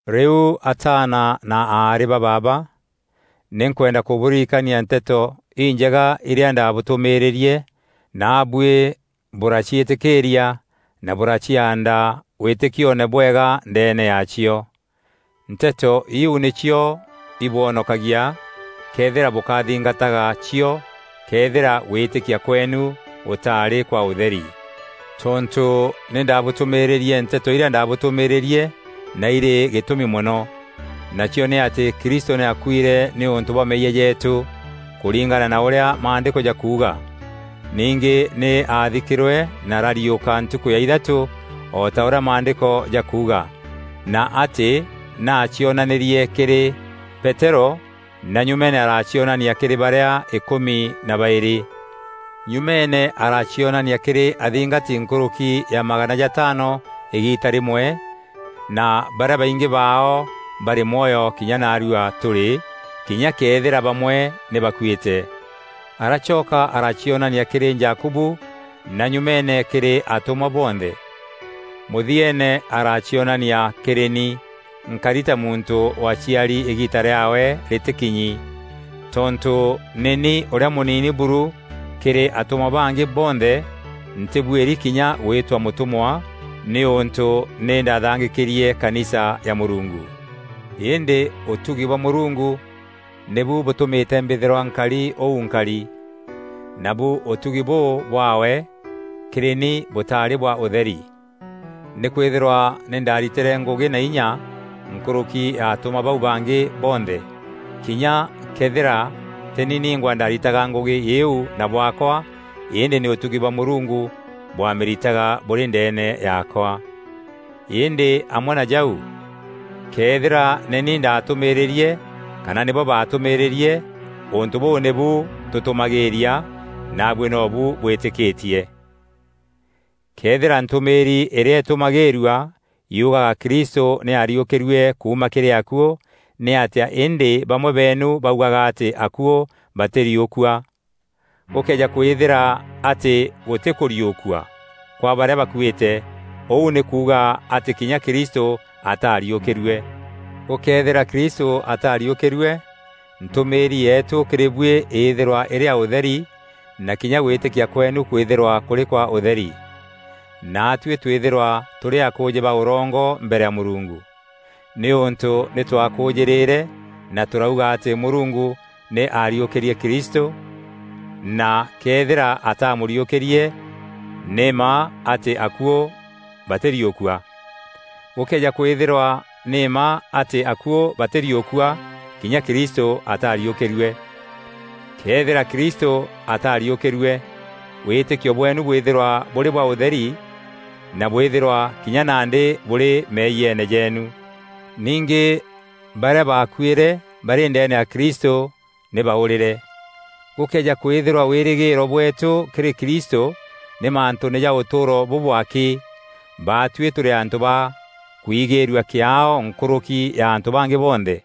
Rîu ataana na aarî ba baaba, nî nkwenda kûbûririkania Nteto Injega irîa ndabûtûmîrîîrie, naabuî bûraciîtîkîîria na bûraciaanda wîtîkioone bwega ndeene yaacio. Nteto îîu nîcio ibwonokagia, këethîra bûkathingataga cio këethîra gwîtîkia kweenu gûtaarî kwa ûtheri. Tontû nî ndabûtûmîrîîrie Nteto irîa ndaatûmîrîîrue na irî gîtûmi mono, nacio nî atî Kristû nî aakuîre nîûntû bwa meeyia jeetû, kûringana na ûrîa Maandîko jakuuga. Ningî nî aathikîrwe na arariûka ntukû ya ithatû o ta ûrîa Maandîko jakuuga, na atî nî aacionanîrie kîrî Peterû na nyumeene aracionania kîrî barîa îkûmi na baîrî. Nyumeene aracionania kîrî athingati nkûrûki ya magana jataano îgiita rîmwe, na barîa baingî baao barî mwoyo kinya naarua tûrî, kinya këethîra bamwe nî bakuîte. Aracoka aaracionania kîrî Jakubu na nyumeene kîrî atûmwa bonthe. Mûthieene aracionania kîrî ni, nkari ta muntû waaciari îgiita rîaawe rîtîkinyi. Tontû nî ni ûrîa mûnini buru kîrî atûmwa bangî bonthe ntîbuîri kinya gwîtwa mûtûmwa, nîûntû nî ndathangîkîrie kanisa ya Mûrungu. Îndî ûtugi bwa Mûrungu nîbu bûtûmîte mbîthîrwa nkari ûu nkari. Nabu ûtugi bûû bwaawe kîrî ni bûtaarî bwa ûtheri. Nîkwîthîrwa nî ndaaritîre ngûgî na inya nkûrûki ya atûmwa bau bangî bonthe, kinya këethîra tî ni ningwa ndaaritaga ngûgî îîu na bwaakwa, îndî nî ûtugi bwa Mûrungu bwaamîritaga bûrî ndeene yaakwa. Îndî amwe na jau, këethîra nî ni ndaatûmîrîîrie kana nîbo baatûmîrîîrie, ûntû bûû nîbu tûtûmagîîria, naabuî nobu bwîtîkîtie. Këethîra ntûmîîri îrîa îtûmagîîrua yugaga Kristû nî aariûkîrue kuuma kîrî akuû, nî atîa îndî bamwe beenu baugaga atî akuû batîriûkua? Gûkëeja kwîthîra atî gûtî kûriûkua kwa barîa bakuîte, ûû nî kuuga atî kinya Kristû ataariûkîrue. Gûkëethîra Kristû ataariûkîrue, ntûmîîri yeetû kîrî buî îthîrwa îrî ya ûtheri na kinya gwîtîkia kweenu kwîthîrwa kûrî kwa ûtheri. Naatuî twîthîrwa tûrî akûûjî ba ûrongo mbere ya Mûrungu, nîûntû nî twakûûjîrîre na tûrauga atî Mûrungu nî aariûkîrie Kristû, na këethîra ataamûriûkîrie, nî mma atî akuû batîriûkua. Gûkëeja kwîthîrwa nî mma atî akuû batîriûkua kinya Kristû ataariûkîrue. Këethîra Kristû ataariûkîrue, wîtîkio bweenu bwîthîrwa bûrî bwa ûtheri na bwîthîrwa kinya nandî bûrî meeyiene jeenu. Ningî barîa baakuîre barî ndeene ya Kristû nî baûrîre. Gûkëeja kwîthîrwa wîrîgîîro bweetû kîrî Kristû nî mantûûne ja ûtûûro bûbû akî, baatuî tûrî antû ba kwigîîrua kîaao nkûrûki ya antû bangî bonthe.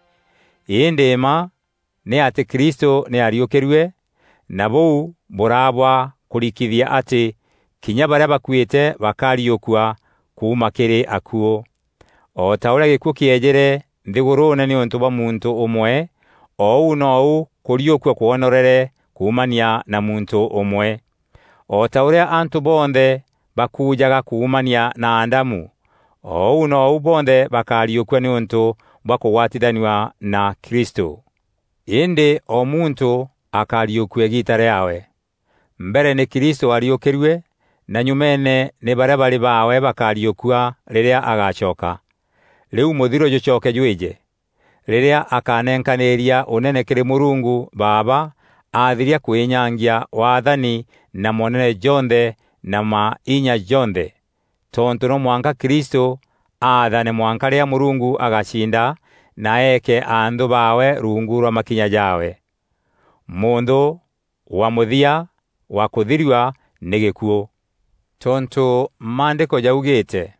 Îndî mma nî atî Kristû nî aariûkîrue, na bûu bûraa bwa kûrikithia atî kinya barîa bakuîte bakariûkua kuuma kîrî akuû. O ta ûrîa gîkuû kîejîre nthîgûrûûne nîûntû bwa muntû ûmwe, o ûu nou kûriûkua kwonorete kuumania na muntû ûmwe. O ta ûrîa antû bonthe bakuujaga kuumania na Adamu o ûu nou bonthe bakariûkua nîûntû bwa kûgwatithanua na Kristû. Îndî o muntû akariûkua îgîîta rîaawe. Mbere nî Kristû waariûkîrue na nyumeene nî barîa barî baawe bakariûkua rîrîa agacoka. Rîu mûthiro jûcoke jwîje, rîrîa akanenkanîîria Ûnene kîrî Mûrungu Baaba, aathiria kwînyangia waathani na moonene jonthe na mainya jonthe. Tontû no mwanka Kristû athane mwanka rîrîa Mûrungu agaciinda na eeke anthû baawe ruungu rwa makinya jaawe. Mûnthû wa mûthia wa kûthirua nî gîkuû. Tontû Maandîko jaugîîte,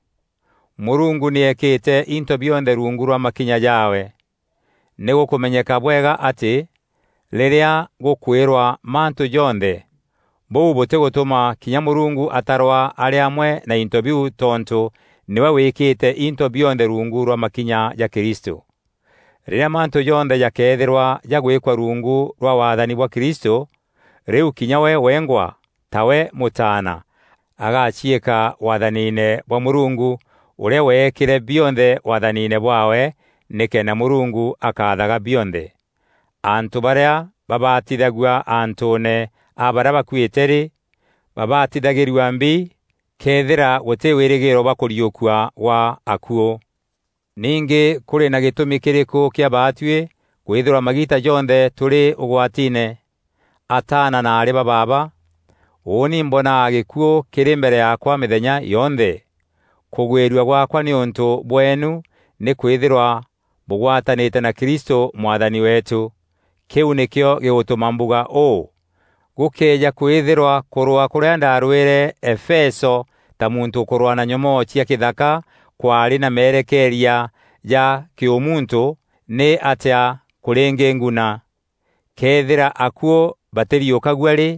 “Mûrungu nî eekîte into bionthe ruungu rwa makinya jaawe.” Nî gûkûmenyeka bwega atî, rîrîa gûkwîrwa “mantû jonthe,” bûu bûtîgûtûma kinya Mûrungu atarwa arî ûmwe wa into biu tontû nîwe wîkîte into bionthe ruungu rwa makinya ja Kristû. Rîrîa mantû jonthe jakeethîrwa jagwîkwa ruungu rwa waathani bwa Kristû, rîu kinya we wengwa, tawe mûtaana, agaciîka waathanine bwa Mûrungu, ûrîa weekîre bionthe waathanine bwaawe, nîkenda Mûrungu akaathaga bionthe. Antû barîa babatithagua antûûne a barîa bakuîte rî, babatithagîrua mbi këethîra gûtî wîrîgîîro bwa kûriûkua gwa akuû? Ningî kûrî na gîtûmi kîrîkû kîa baatuî kwîthîrwa magiita jonthe tûrî ûgwatiine? Ataana na aarî ba baaba, ûûni mbonaga gîkuû kîrî mbere yaakwa mîthenya yonthe! Kûgwîrua gwaakwa nîûntû bweenu nî kwîthîrwa bûgwatanîte na Kristû Mwathani weetû. Kîu nîkîo gîgûtûma mbuga ûû. Gûkëeja kwîthîrwa kûrwaa kûrîa ndaarwîîre Efeso ta muntû ûkûrwaa na nyomoo cia kîthaka kwaarî na merekeeria ja kîûmuntû, nîatîa kûrîngînguna? Këethîra akuû batîriûkagua rî,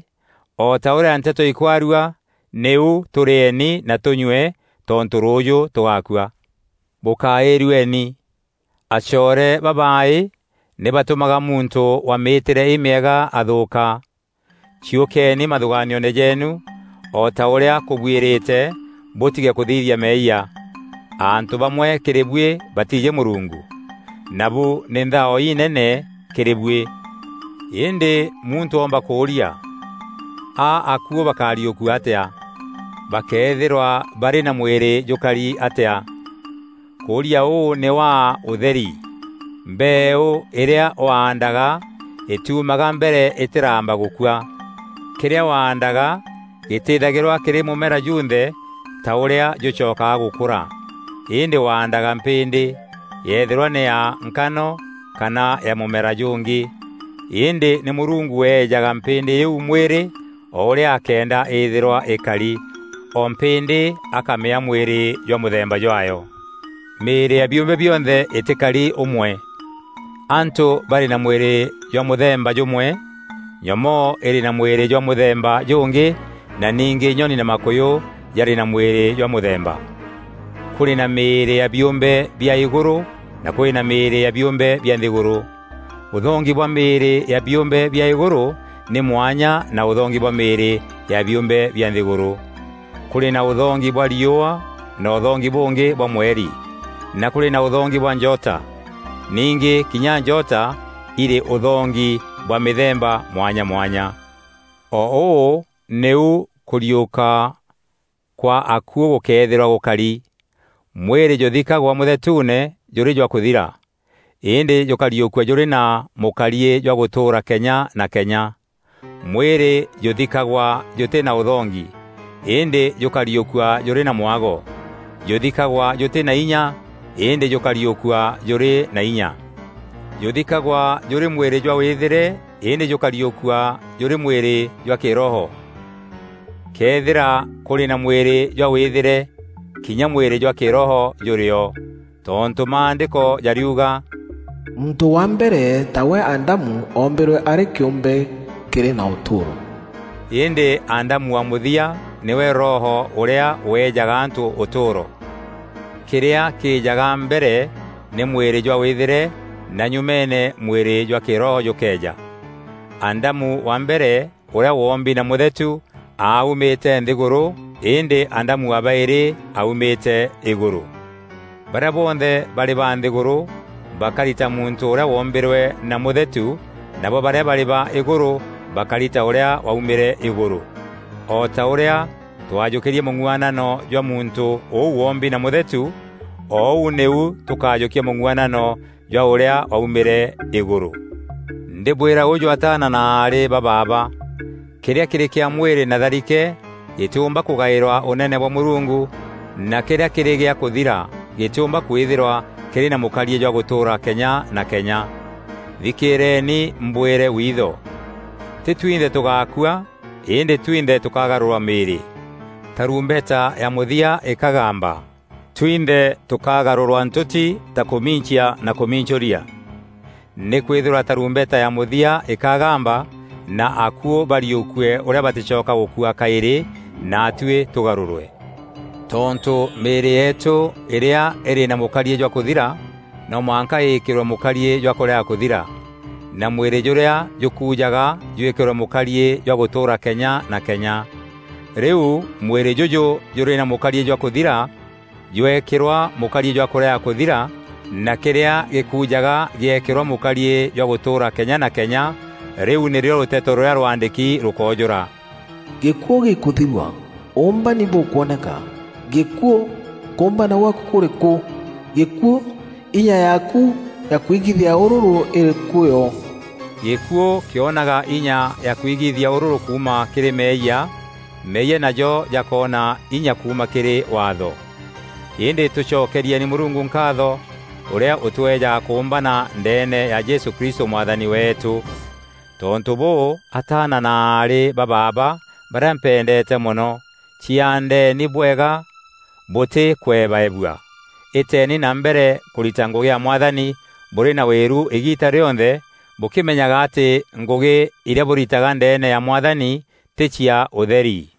o ta ûrîa nteto ikwarua, nîu “Tûrîeni na tûnyue, tontû rûûjû tûgakua.” Bûkaîrueni! Acoore babaaî nî batûmaga muntû wa mîîtîre îmîega athûûka. Ciûkeni mathûgaanioone jeenu o ta ûrîa kûbuîrîte, bûtige kûthithia meeyia. Antû bamwe kîrî buî batiijî Mûrungu. Nabû nî nthao inene kîrî buî. Îndî muntû oomba kûûria, “A akuû bakariûkua atîa? Bakeethîrwa barî na mwîrî jûkari atîa?” Kûria ûû nî waa utheri! Mbeeû îrîa waandaga îtiumaga mbere îtîramba gûkua. Kîrîa waandaga gîtîthagîrwa kîrî mûmera junthe ta ûrîa jûcokaga gûkûra, îndî waandaga mpîndî, yeethîrwa nî ya nkano kana ya mûmera jûngî. Îndî nî Mûrungu weejaga mpîndî îîu mwîrî o ûrîa akeenda îthîrwa îkari, o mpîndî akamîaa mwîrî jwa mûthemba jwaayo. Mîîrî ya biûmbe bionthe îtîkari ûmwe. Antû barî na mwîrî jwa mûthemba jûmwe, nyomoo îrî na mwîrî jwa mûthemba jûngî, na ningî nyoni na makûyû jarî na mwîrî jwa mûthemba. Kûrî na mîîrî ya biûmbe bia îgûrû na kûrî na mîîrî ya biûmbe bia nthîgûrû. Ûthongi bwa mîîrî ya biûmbe bia îgûrû nî mwanya na ûthongi bwa mîîrî ya biûmbe bia nthîgûrû. Kûrî na ûthongi bwa riûa na ûthongi bûngî bwa mweri, na kûrî na ûthongi bwa njota. Ningî kinya njota irî ûthongi bwa mîthemba mwanya mwanya. O ûû nîu kûriûka gwa akuû gûkeethîrwa gûkari. Mwîrî jûthikagwa mûthetuune jûrî jwa kûthira, îndî jûkariûkua jûrî na mûkariî jwa gûtûûra kenya na kenya. Mwîrî jûthikagwa jûtî na ûthongi, îndî jûkariûkua jûrî na mwago. Jûthikagwa jûtî na inya, îndî jûkariûkua jûrî na inya. Jûthikagwa jûrî mwîrî jwa wîthîre îndî jûkariûkua jûrî mwîrî jwa kîroho. Këethîra kûrî na mwîrî jwa wîthîre, kinya mwîrî jwa kîroho jûrî o. Tontû Maandîko jariuga, “Muntû wa mbere, tawe Adamu, oombîrwe arî kîûmbe kîrî na ûtûûro,” îndî Adamu wa mûthia nîwe Roho ûrîa weejaga antû ûtûûro. Kîrîa kîîjaga mbere nî mwîrî jwa wîthîre na nyûmeene mwîrî jwa kîroho jûkeeja. Adamu wa mbere ûrîa wombi na mûthetu aaumîte nthîgûrû îndî Adamu wa baîrî aaumîte îgûrû. Barîa bonthe barî ba nthîgûrû bakari ta muntû ûrîa woombîrwe na mûthetu nabo barîa barî ba îgûrû bakari ta ûrîa waumîre îgûrû. O ta ûrîa twajûkîrie mûng'uanano jwa muntû ûu wombi na mûthetu, o ûu nîu tûkajûkia mûng'uanano jwa ûrîa waumîre îgûrû. Ndîbwîra ûjû ataana na aarî ba baaba, kîrîa kîrî kîa mwîrî na tharike gîtîûmba kûgaîrwa ûnene bwa Mûrungu, na kîrîa kîrî gîa kûthira gîtîûmba kwîthîrwa kîrî na mûkariî jwa gûtûûra kenya na kenya. Thikîîreni mbwîre witho: tî twinthe tûgakûa îndî twinthe tûkagarûrwa mîîrî, tarumbeta ya mûthia îkagamba twinthe tûkagarûrwa ntûti ta kûmincia na kûmincûria. Nîkwîthîrwa tarumbeta ya mûthia îkagamba na akuû bariûkue ûrîa batîcoka gûkua kaîrî, naatuî tûgarûrwe. Tontû mîîrî yeetû îrîa îrî na mûkariî jwa kûthira no mwanka îîkîrwe mûkariî jwa kûrega kûthira, na mwîrî jûrîa jûkuujaga jwîkîrwe mûkariî jwa gûtûûra kenya na kenya. Rîu, mwîrî jûjû jûrî na mûkariî jwa kûthira jweekîrwa mûkariî jwa kûrega kûthira, na kîrîa gîkujaga gîeekîrwa mûkariî jwa gûtûûra kenya na kenya, rîu nîrîo rûteto rûrîa rwaandîki rûkoojûra; “Gîkuû gîkûthirua; ûûmbani bûkwoneka!” “Gîkuû, kûûmbana gwaaku kûrî kû? Gîkuû, inya yaaku ya kwigithia ûrûrû îrî kû yo?” Gîkuû kîonaga inya ya kwigithia ûrûrû kuuma kîrî meeyia, meeyia najo jakoona inya kuuma kîrî Waatho. Îndî tûcokerieni Mûrungu nkaatho ûrîa ûtweejaga kûûmbana ndeene ya Jesû Kristû Mwathani weetû. Tontû bûû, ataana na aarî ba baaba barîa mpendeete mono, ciaandeni bwega bûtî kwebaebua. Îteeni na mbere kûrita ngûgî ya Mwathani bûrî na wîru îgiita rîonthe, bûkîmenyaga atî ngûgî irîa bûritaga ndeene ya Mwathani tî cia ûtheri.